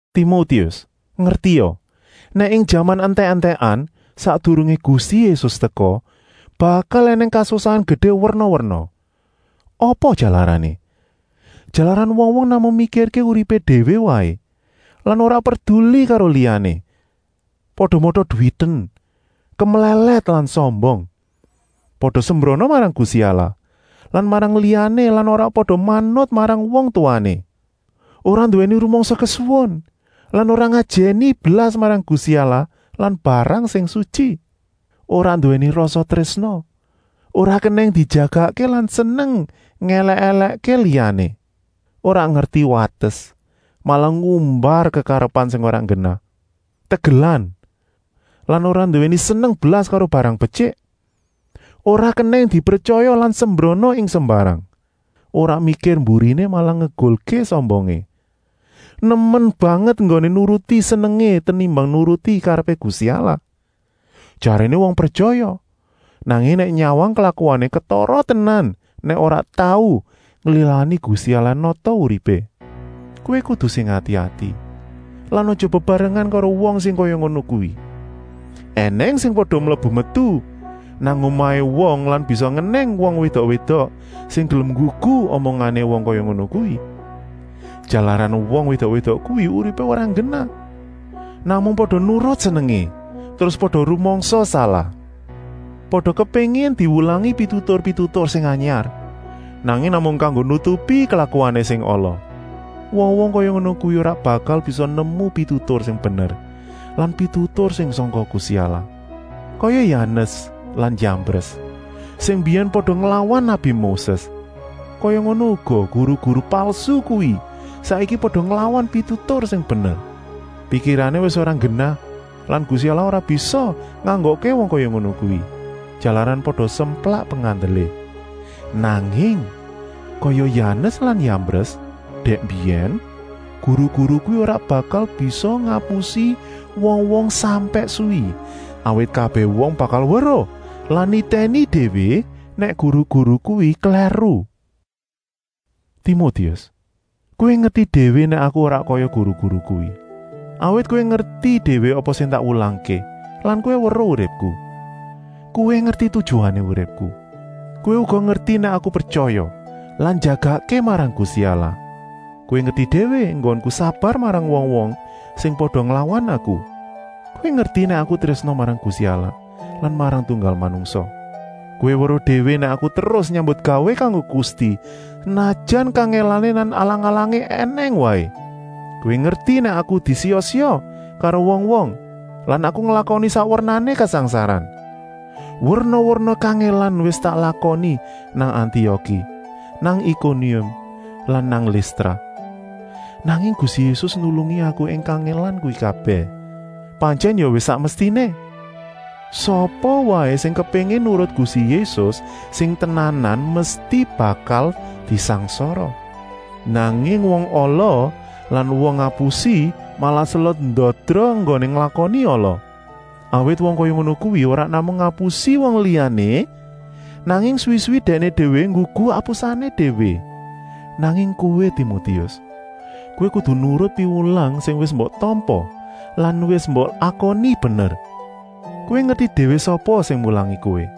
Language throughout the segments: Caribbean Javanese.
Timotius, ngertia, nèk ing jaman entèk-entèkan, sakdurungé Gusti Yésus teka, bakal ènèng kasusahan gedé werna-werna. Apa jalarané? Jalaran wong-wong namung mikirké uripé déwé waé lan ora perduli karo liyané. Pada mata-duwiten, kemlèlèt lan sombong. Pada sembrana marang Gusti Allah lan marang liyané lan ora pada manut marang wong tuwané. Ora nduwèni rumangsa kesuwun lan ora ngajèni blas marang Gusti Allah lan barang sing sutyi. Ora nduwèni rasa trésna, ora kenèng dijagakké lan seneng ngèlèk-èlèkké liyané. Ora ngerti wates, malah ngumbar kekarepan sing ora nggenah, tegelan lan ora nduwèni seneng blas karo barang betyik. Ora kenèng dipretyaya lan sembrana ing sembarang, ora mikir mburiné, malah ngegulké sombongé. Nemen banget enggoné nuruti senengé tenimbang nuruti karepé Gusti Allah. Jaréné wong pretyaya, nanging nèk nyawang klakuané ketara tenan nèk ora tau nglilani Gusti Allah nata uripé. Kowé kudu sing ati-ati lan aja bebarengan karo wong sing kaya ngono kuwi. Enèng sing pada mlebu-metu nang omahé wong lan bisa ngenèng wong wédok-wédok sing gelem nggugu omongané wong kaya ngono kuwi. Jalaran wong wédok-wédok kuwi uripé ora nggenah, namung pada nurut senengé terus pada rumangsa salah. Pada kepéngin diwulangi pitutur-pitutur sing anyar, nanging namung kanggo nutupi klakuané sing ala. Wong-wong kaya ngono kuwi ora bakal bisa nemu pitutur sing bener lan pitutur sing sangka Gusti Allah. Kaya Yanes lan Yambres sing mbiyèn pada nglawan nabi Moses, kaya ngono uga guru-guru palsu kuwi saiki pada nglawan pitutur sing bener. Pikirané wis ora nggenah lan Gusti Allah ora bisa nganggokké wong kaya ngono kuwi, jalaran pada semplak pengandelé. Nanging, kaya Yanes lan Yambres dèk mbiyèn, guru-guru kuwi ora bakal bisa ngapusi wong-wong sampèk suwi, awit kabèh wong bakal weruh lan nitèni déwé nèk guru-guru kuwi klèru. Timotius, kowé ngerti déwé nèk aku ora kaya guru-guru kuwi, awit kowé ngerti déwé apa sing tak wulangké lan kowé weruh uripku. Kowé ngerti tujuané uripku. Kowé uga ngerti nèk aku pretyaya lan njagakké marang Gusti Allah. Kowé ngerti déwé enggonku sabar marang wong-wong sing pada nglawan aku. Kowé ngerti nèk aku trésna marang Gusti Allah lan marang tunggal manungsa. Kowé weruh déwé nèk aku terus nyambutgawé kanggo Gusti, senajan kangèlané lan alang-alangané ènèng waé. Kowé ngerti nèk aku disiya-siya karo wong-wong lan aku nglakoni sak wernané kasangsaran. Werna-werna kangèlan wis tak lakoni nang Antioki, nang Ikonium lan nang Listra. Nanging Gusti Yésus nulungi aku ing kangèlan kuwi kabèh. Pantyèn ya wis sak mestiné. Sapa waé sing kepéngin nurut Gusti Yésus sing tenanan mesti bakal disangsara. Nanging wong ala lan wong ngapusi malah selot ndadra enggoné nglakoni ala. Awit wong kaya ngono kuwi ora namung ngapusi wong liyané, nanging suwi-suwi dèkné déwé nggugu apusané déwé. Nanging kowé Timotius, kowé kudu nurut piwulang sing wis mbok tampa lan wis mbok akoni bener. Kowé ngerti déwé sapa sing mulangi kowé.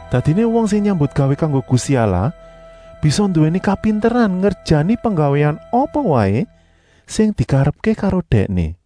Dadiné wong sing nyambutgawé kanggo Gusti Allah bisa nduwèni kapinteran ngerjani penggawéan apa waé sing dikarepké karo Dèkné.